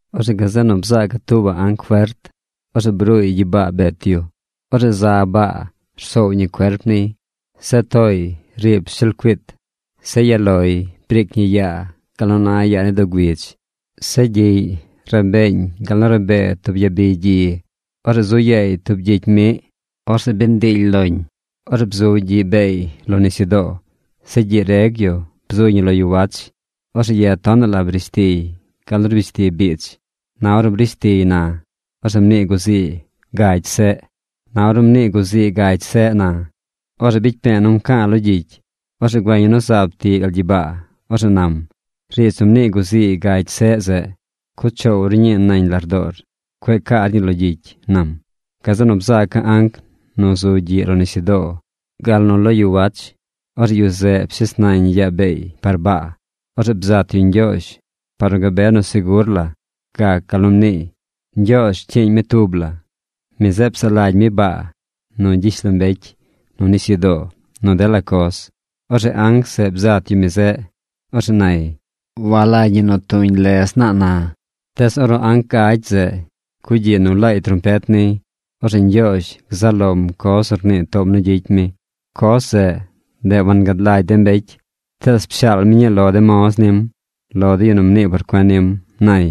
Orzeꞌ gazeꞌ nu bzaaca̱ tuubaꞌ anc fert. Orzeꞌ bruuy gyibaa bet yu. Orzeꞌ za baa rsoow ñi cuerp niy. Zeꞌ tooy riib shelcuit. Zeꞌ ya loy briic ñi yaa gal nu na yaa ni doo güidz. Zeꞌ gyiꞌy rabeeñ gal nu rabee tub yabi gyi. Orzeꞌ zu yaay tub gyicy miꞌ. Orzeꞌ bi ndiily loñ. Orzeꞌ bzu gyiꞌ beey lo nisyudoo. Zeꞌ gyiꞌ reg yu bzuy ñi lo yu wach. Orzeꞌ ye tonaꞌ la brish tiy gal nu rbish ti biidz. Na ornu brish tiy na, orzeꞌ mnii guzii gagy seꞌ. Na ornu mnii guzii gagy seꞌ na, orzeꞌ bicy pe̱e̱ nu nca̱a̱ lo gyicy. Orzeꞌ güeña̱ nu zaab tiꞌ gal gyibaa. Orzeꞌ nam: ―Riidz nu mnii guzii gagy seꞌ zeꞌ, cuꞌ choow ru ñii nañ lardoor. Cueꞌ caar ñii lo gyicy ―nam. Gazeꞌ nu bzaaca̱ anc nu zu gyiꞌ lo nisyudoo gal nu lo yu wach, orzeꞌ yu zeꞌ pshes nañ yaa beey par baa. Orzeꞌ bzat yu Ñgyoozh par nu gabe nu segur la gac gal nu mniiy. Ñgyoozh rcyiiñ mi tub la. Mi zeꞌ psaꞌ lagy mi baa, nu gyishlombecy, nu nisyudoo, nu dela coz. Orzeꞌ anc zeꞌ bzat yu mi zeꞌ. Orzeꞌ nay: ―Walagy ñi nu tuñ lez naa na. Tees ornu anc gagy zeꞌ cugyiꞌ nu laay trompet niy, orzeꞌ Ñgyoozh gzaꞌ lom coz nu rnii toom nu gyicy mi. Coz zeꞌ, ndeꞌ wangad lagy de mbecy. Tees pshaal mi ñii lo de moz nim, lo de yu nu mnii por cuen nim ―nay.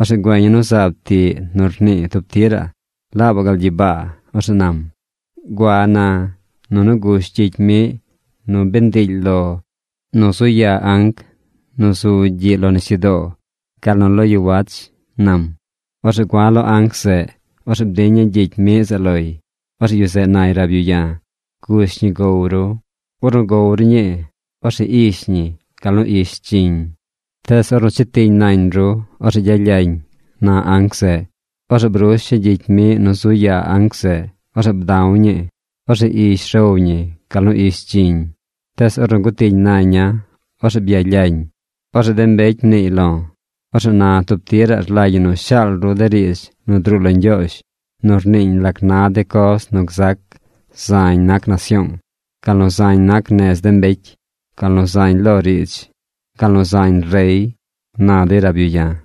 Orzeꞌ güeña̱ nu zaab tiꞌ nu rnii tub tiraꞌ laabaꞌ gal gyibaa. Orzeꞌ nam: ―Gua na, nunu gush gyicy miꞌ nu bi ndiily lo nu zu yaa anc nu zu gyiꞌ lo nisyudoo gal nu lo yu wach ―nam. Orzeꞌ gua̱ lo anc zeꞌ. Orzeꞌ bdiña̱ gyicy miꞌ zeꞌ loy. Orzeꞌ yu zeꞌ nay rab yu ya̱: ―Gush ñi gow ru. Ornu gow ru ñii, orzeꞌ ish ñi gal nu ish dziñ. Tees ornu chetiñ nañ ru, orzeꞌ gyalyañ ―na anc zeꞌ. Orzeꞌ brusha̱ gyicy miꞌ nu zu yaa anc zeꞌ. Orzeꞌ bda̱w ñii. Orzeꞌ ish row ñi gal nu ish dziñ. Tees ornu gutiñ naña̱, orzeꞌ byalyañ. Orzeꞌ de mbecy mniiy lo̱: ―Orzeꞌ na tub tiraꞌ rlagy ñi nu shaal ru de riidz nu druu lo Ñgyoozh nu rniiñ lac na de coz nu gzac zañ nac nasyoong, gal nu zañ nac nez de mbecy, gal nu zañ lo riidz, gal nu zañ rey ―na dey rab yu ya̱.